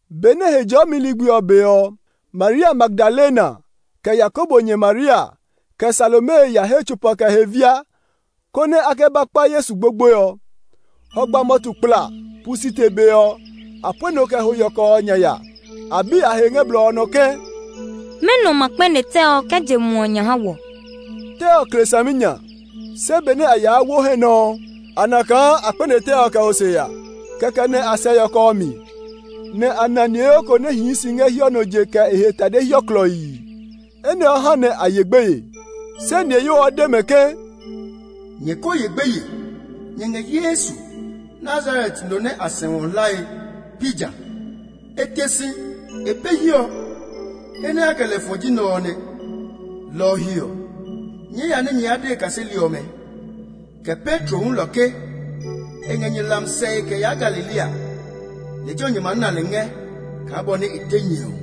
Benɛ Hejɔɔmi ligbi ɔ be ɔ, Maria Magdalena, kɛ Yakobo nyɛ Maria, kɛ Salome ya he tsopa kɛ e he via, konɛ a kɛ ba kpa Yesu gbogboe ɔ. Hɔgba mɔtu kpla, pu site be ɔ, a pue nɔ kɛ ho yɔkɔ ɔ nya ya. A bi a he ngɛ blɔ ɔ nɔ ke, “Mɛnɔ ma kpɛne tɛ ɔ kɛ je muɔ ɔ nya ha wɔ?” (Tɛ ɔ kle saminya). Se benɛ a yaa wo hɛ nɔ ɔ, a na kaa a kpɛne tɛ ɔ kɛ ho se ya. Kɛkɛ nɛ a sɛ yɔkɔ ɔ mi, nɛ a na niheyo ko nɛ hii si ngɛ hiɔ nɔ je kɛ e he tade hiɔ klɔii. Enɛ ɔ ha nɛ a ye gbeye. Se niheyo ɔ de mɛ ke, “Nyɛ ko ye gbeye! Nyɛ ngɛ Yesu, Nazaret no nɛ a sɛu ɔ hlae; pi jã? E te si! E be hiɛ ɔ. He nɛ a kɛ lɛ fɔ ɔ ji nɛ ɔ nɛ. Lɔ ɔ he ɔ, nyɛɛ ya nɛ nyɛ de e kaseli ɔmɛ, kɛ Petro hulɔ ke, e ngɛ nyɛ hlami sɛe kɛ yaa Galilea; lejɛ ɔ nyɛ maa na lɛ ngɛ kaa bɔ nɛ e de nyɛ ɔ.”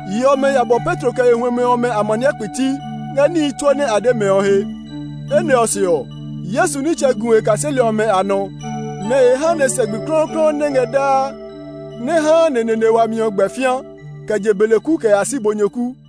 Yi ɔmɛ ya bɔ Petro kɛ e huɛmɛ ɔmɛ amaniɛ kpiti ngɛ níhi tsuo nɛ a de mɛ ɔ he. Enɛ ɔ se ɔ, Yesu nitsɛ gu e kaseli ɔmɛ a nɔ nɛ e ha nɛ sɛ gbi klɔuklɔu nɛ ngɛ daa nɛ haa neneene wami ɔ gbɛ fĩa kɛ je beleku kɛ ya si bonyoku.]